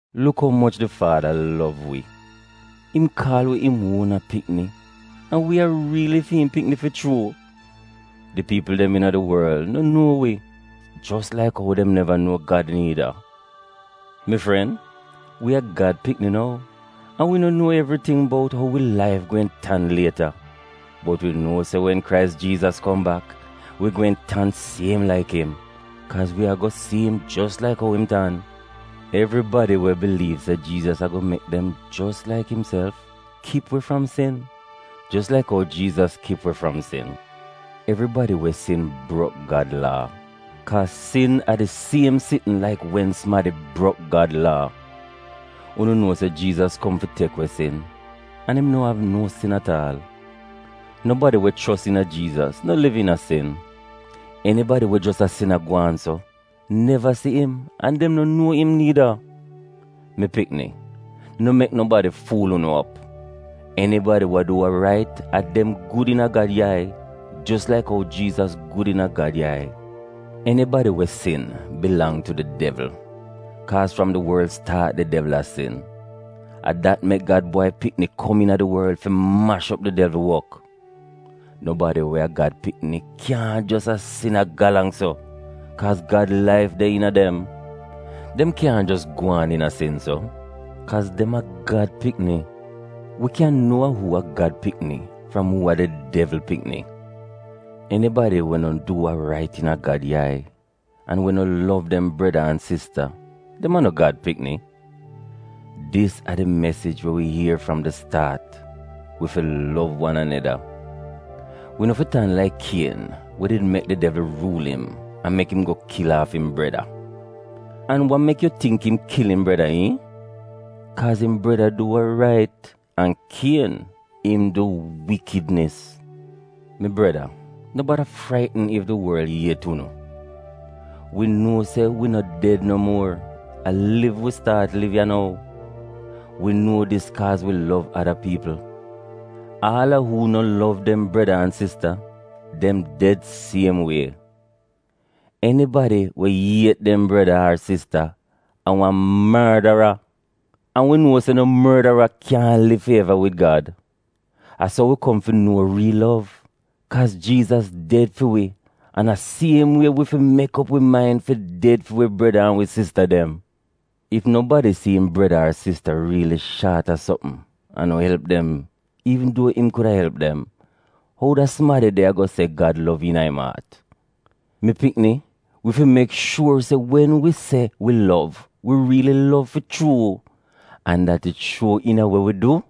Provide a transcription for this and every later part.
Luk umoch di Faada lov wi. Im kaal wi im uona pikni, an wi a riili fi im pikni fi chuu. Di piipl dem iina di worl no nuo wi, jos laik ou dem neva nuo Gad niida. Mi fren, wi a Gad pikni nou an wi no nuo evriting bout ou wi laif gweehn tan lieta, bot wi nuo se wen Krais Jiizas kom bak, wi gweehn tan siem laik im, kaaz wi ago si im jos laik ou im tan. Evribadi we biliiv se Jiizas ago mek dem jos laik imself, kip we fram sin, jos laik ou Jiizas kip we fram sin. Evribadi we sin brok Gad Laa, kaaz sin a di siem sitn laik wen sumadi brok Gad Laa. Unu nuo se Jiizas kom fi tek we sin an im no av no sin at aal. Nobadi we chos iina Jiizas no liv iina sin. Enibadi we jos a sin a gwaan so neva si im an dem no nuo im niida. Mi pikni, no mek nobadi fuul unu op. Enibadi wa du wa rait a dem gud iina Gad yai, jos laik ou Jiizas gud iina Gad yai. Enibadi we sin bilang tu di devl, kaaz fram di worl staat di devl a sin. A dat mek Gad Bwai Pikni kom iina di worl, fi mash op di devl wok. Nobadi we a Gad pikni kyaahn jos a sin a galang so, kaaz Gad laif de iina dem. Dem kyaahn jos gwaan iina sin so, kaaz dem a Gad pikni. Wi kyan nuo uu a Gad pikni fram uu a di Devl pikni. Enibadi we no du wa rait iina Gad yai, an we no lov dem breda an sista, dem a no Gad pikni. Dis a di mesij wi ier fram di staat: wi fi lov wan aneda. Wi no fi tan laik Kien we did mek di devl ruul im an mek im go kil aaf im breda. An wa mek yu tingk im kil im breda, iihn? Kaaz im breda du wa rait an Kien, im du wikidnis. Mi breda no bada fraitn ef di worl iet unu. Wi nuo se wi no ded no muor, a liv wi staat liv ya nou. Wi nuo dis kaaz wi lov ada piipl. Aal a uu no lov dem breda an sista, dem ded siem wie. Enibadi we iet dem breda ar sista a wan mordara, an wi nuo se no mordara kyaahn liv fi eva wid Gad. A so wi kom fi nuo riil lov, kaaz Jiizas ded fi wi an a siem wie wi fi mek op wi main fi ded fi wi breda an wi sista dem. Ef nobadi si im breda ar sista riili shaat a sopm an no elp dem iivn duo im kuda elp dem, ou da sumadi de ago se Gad lov iina im aat? Mi pikni, wi fi mek shuor se wen wi se wi lov, wi riil lov fi chuu, an dat it shuo iina we wi du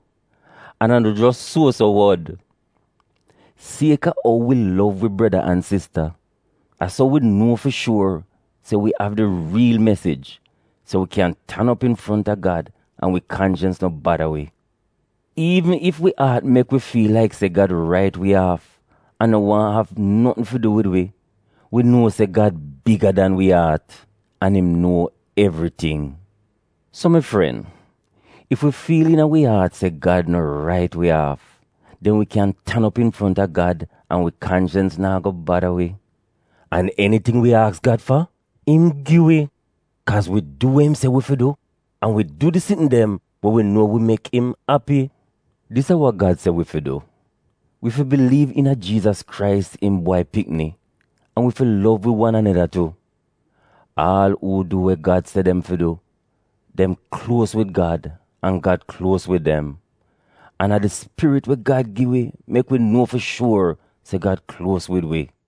an a no jos suo-so wod. Sieka ou wi lov wi breda an sista, a so wi nuo fi shuor se wi av di riil mesij, so wi kyan tan op infronta Gad an wi kanchens no bada wi. Iivn ef wi aat mek wi fiil laik se Gad rait wi aaf an no waahn av notn fi du wid wi, wi nuo se Gad biga dan wi aat, an im nuo evriting. So mi fren, ef wi fiil iina wi aat se Gad no rait wi aaf, den wi kyan tan op infronta Gad an wi kanchens naa go bada wi, an eniting wi aks Gad fa im gi wi, kaaz wi du we im se wi fi du an wi du di sitn dem we wi nuo mek im api. Dis a wa Gad se wi fi du, wi fi biliiv iina Jiizas Krais, im Bwai Pikni, an wi fi lov wi wan aneda tu. Aal uu du we Gad se dem fi du dem kluos wid Gad an Gad kluos wid dem. An a di Spirit we Gad gi wi mek wi nuo fi shuor se Gad kluos wid wi.